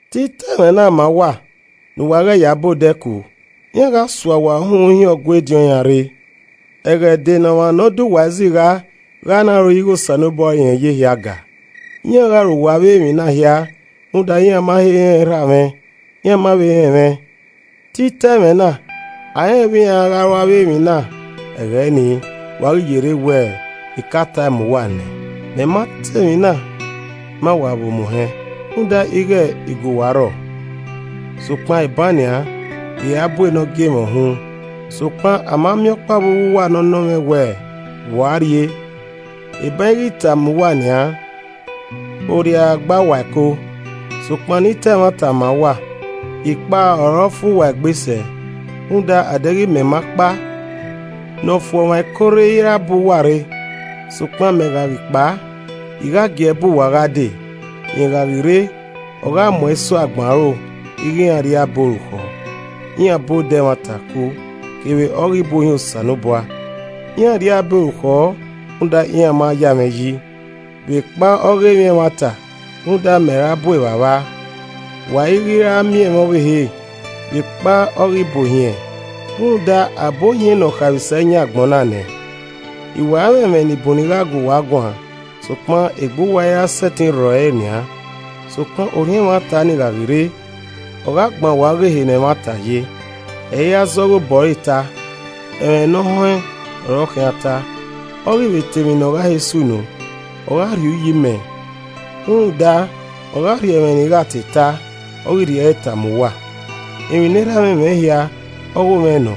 “Te I ta ẹmwẹ na ma uwa ne uwa ghẹ ya ba odẹ ku. Iran gha sua uwa uhunmwu hin uwu Ọgua ediọn iran rre. Ẹghẹ dee ne ọmwa ne ọ de uwa izigha gha na ro ighe Osanobua ọre irẹn ya ehia ga. Iran gha ru uwa avbe emwi na hia rhunmwuda iran ma he rẹn Erha mwẹ, iran ma vbe rẹn mwẹ. Te I ta ẹmwẹ na, a i rẹn vbe iran a gha ru avbe emwi na ẹghẹ ni, wa ghi ye rre wẹ I ka ta ẹe ma uwa nẹ. Iwinna Orhiọn Ne Ọ Huanrẹn “Mẹ ma ta emwi na ma uwa vbe omuhẹn, rhunmwuda ighe I gu uwa rrọọ. Sokpan, eban nian, I ra bu ne ọ gie mwẹ uhunmwu. Sokpan a ma miẹn ọkpa vbe uwu uwa ne ọ nọ mwẹ wẹ, ‘Vbe u a rrie?’ Eban I ghi ta ẹe ma uwa nian, orriara gba uwu ẹko. Sokpan ne I ta ẹmwata ma uwa, I kpao ọ re ọ fu uwa egbe sẹ, rhunmwuda a deghẹ mẹ ma kpao, Ne ọ fu ọmwa ẹko rre i ra bu uwa rre. Sokpan mẹ gha ghi kpao, I gha gi ẹe bu uwa gha dee. Rẹn gha ghi rre, ọ gha mu ẹn so agbọn aro ighe iran rri abe orukhọ, iran ba odẹ ẹmwata ku, kevbe ọghe ibuohiẹn Osanobua. Iran rri abe orukhọ rhunmwuda iran ma ya mwẹ yi. Vbekpa ọghe emwi ẹmwata, rhunmwuda mẹ ra bu Evbavba, wa i ghi ra miẹn mwẹ ọvbehe. Vbekpa ọghe ibuohiẹn, rhunmwuda a bu ohiẹn ne ọ khaemwisẹ yan agbọn na nẹ. “I wa mwẹ, ẹmwẹ ni bun ne I gha gu uwa guan, sokpan egbe uwa i ra sẹtin rrọ ẹre nian. Sokpan Orhiọn ẹmwata ni gha ghi rre, ọ gha gban uwa ghe ehe ne ẹmwata ye. Ẹ i ra zẹ ọghe obọ ẹre ta, ẹmwẹ ne ọ họẹn ọre ọ khian ta, ọ ghi vbe ta emwi ne ọ gha he sunu. Ọ gha rhie uyi mẹ, rhunmwuda, ọ gha rhie ẹmwẹ ne I gha te ta, ọ ghi rhie ẹre ta ma uwa. Emwi ne Erha mwẹ mwẹ hia, ogho mwẹ nọ,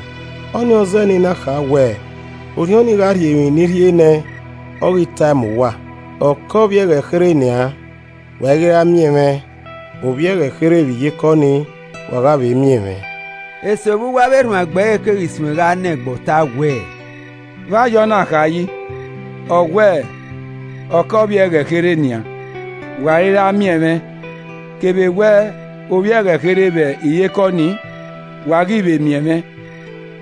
ọnii ọ zẹẹ ne I na kha wẹ Orhiọn nii gha rhie emwi ne I rhie ne ẹn, ọ ghi ta ẹe ma uwa. “Ọ kẹe ovbi ẹghẹ kherhe nian, wa i ghi ra miẹn mwẹ, ovbi ẹghẹ kherhe vbe iyeke ọnii, wa gha vbe miẹn mwẹ.” Eso vbe uwu avbe erhuanegbe ẹre keghi suẹn gha nọ egbe ọta wẹẹ, “Vbe a ye ọna kha yi? Ọ wẹẹ, ‘Ọ kẹe ovbi ẹghẹ kherhe nian wa i ghi ra miẹn mwẹ kevbe wẹ ovbi ẹghẹ kherhe vbe iyeke ọnii, wa gha vbe miẹn mwẹ,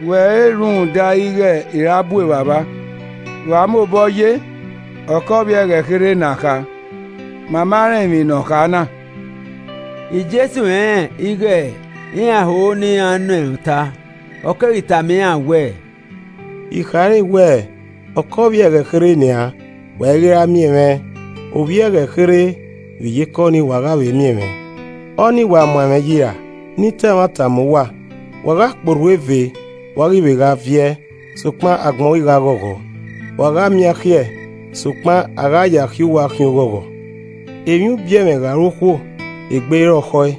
wẹ re rhunmwuda ighe I ra bu Evbavba.’ Vbe a mobọ ye ‘Ọ kẹe ovbi ẹghẹ kherhe na kha?’ Ma ma rẹn emwi ne ọ kha na!” Jesu rẹnrẹn ighe iran ho ne iran nọ irẹn ọta, ọ keghi tama iran wẹẹ, “I khare wẹ, ‘Ọ kẹe ovbi ẹghẹ kherhe nian, wa i ghi ra miẹn mwẹ, ovbi ẹghẹ kherhe vbe iyeke ọnii, wa gha vbe miẹn mwẹ.’ Ọnii wa muan ẹmwẹ yi ra? Ne I ta ẹmwata ma uwa: Wa gha kpe orhu eve, wa ghi vbe gha viẹ, sokpan agbọn ghi gha ghọghọ, wa gha miẹn akhiẹ, sokpan a ya akhiẹ uwa khian oghọghọ. Emwi ubiẹmwẹ gha ru okhuo, egbe i rọkhọ ẹe,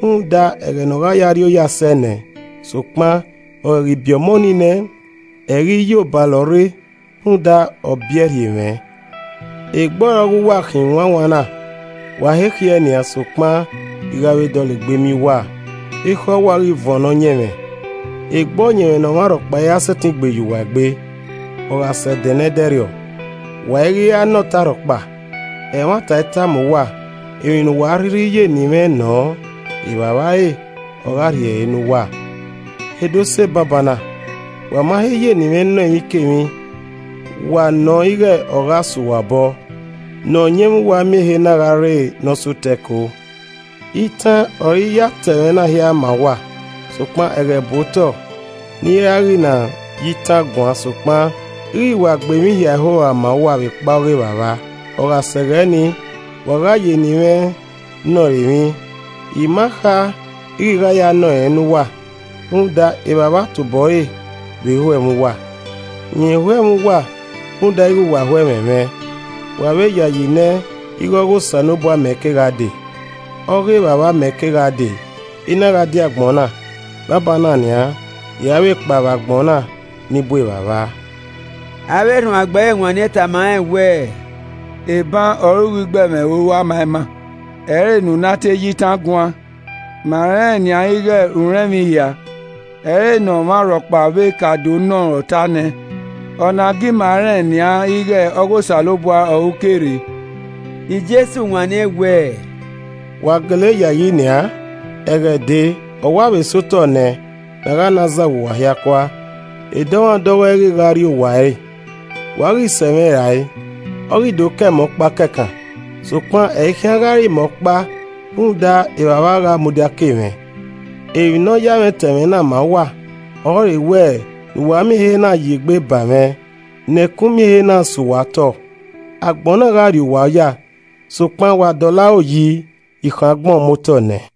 rhunmwuda ẹghẹ ne ọ gha ya rri oya sẹ nẹ, sokpan, ọ ghẹ ghi biẹ ọmọ nii nẹ, ẹ i ghi ye obalọ rre rhunmwuda, ọ biẹe rhie mwẹ. Egbe ọre ọghe uwa khin, wanwan na, wa he khiẹ nian, sokpan, I gha vbe dọlegbe miẹn uwa, ekhọe uwa ghi vuọn ne ọyẹnmwẹ, egbe ọyẹnmwẹ ne ọmwa rhọkpa i ra sẹtin gbe ye uwa egbe. “Ọ gha sẹ ẹdẹ nẹdẹrriọ, wa i ghi ra nọ mwẹ ọta rhọkpa: Ẹmwata I tama uwa, emwi ne uwa a rhirhi ya eni mwẹ nọ Evbavba re, ọ gha rhie ẹre ne uwa. He do sẹ banbanna, wa ma he ya eni mwẹ nọ emwikemwi, wa nọ ighẹ ọ gha sẹ uwa obọ. Ne ọyẹnmwẹ uwa miẹn ehe na gha re ne ọ sẹ otọ ẹko. “Itan ọre I ya ta ẹmwẹ na hia ma uwa, sokpan ẹghẹ bu otọ ne I i ra ghi na ya itan guan sokpan I ghi wa gbe emwi hia ẹho rua ma uwa vbekpa ọghe Evbavba. Ọ gha sẹ ẹghẹ nii, wa gha ya eni mwẹ nọ ẹre emwi, I ma kha ighẹ I gha ya nọ rẹn ne uwa. Rhunmwuda Evbavba tobọ ẹre vbe ho ẹmwẹ uwa. Rẹn ho ẹmwẹ uwa rhunmwuda ighẹ wa ho ẹmwẹ mwẹ, wa vbe yayi nẹ ighẹ ọghe Osanobua mẹ ke gha dee. Ọ ghe Evbavba mẹ ke gha dee, I na gha die agbọn na, banbanna nian, I ra vbe kpao vbe agbọn na ne I bu Evbavba.” Avbe erhuanegbe ẹre wanniẹn tama rẹn wẹẹ, “Eban ọre u ghi gbe ẹmwẹ ẹho rua ma ima, ẹ i ghi re ne u na te ya itan guan. Ma rẹnrẹn nian ighẹ u rẹn emwi hia, ẹ i re ne ọmwa rhọkpa vbe ka do nọ ruẹn ọta nẹ. Ọna gie ima rẹn nian ighẹ ọghe Osanobua ọre u ke rre.” Jesu wanniẹn wẹẹ, “Wa gele yayi nian? Ẹghẹ dee, ọ wa vbe sẹ otọ nẹ ne a gha na zagha uwa hia kua, edọmwadẹ ọghọe ghi gha rrie owa ẹre, wa ghi sẹ mwẹ rae ọ ghi do kẹ mẹ ọkpa kẹkan. Sokpan ẹ i khian gha re imẹ ọkpa rhunmwuda, Evbavba gha mudia ke mwẹ. Emwi ne ọ ya mwẹ ta ẹmwẹ na ma uwa ọrọre wẹ ne uwa miẹn ehe na ya egbe ba mwẹ, ne ẹkun miẹn ehe na sẹ uwa otọ. Agbọn na gha rri uwa oya. Sokpan wa dọlọ aro yi I khọn agbọn muotọ nẹ.”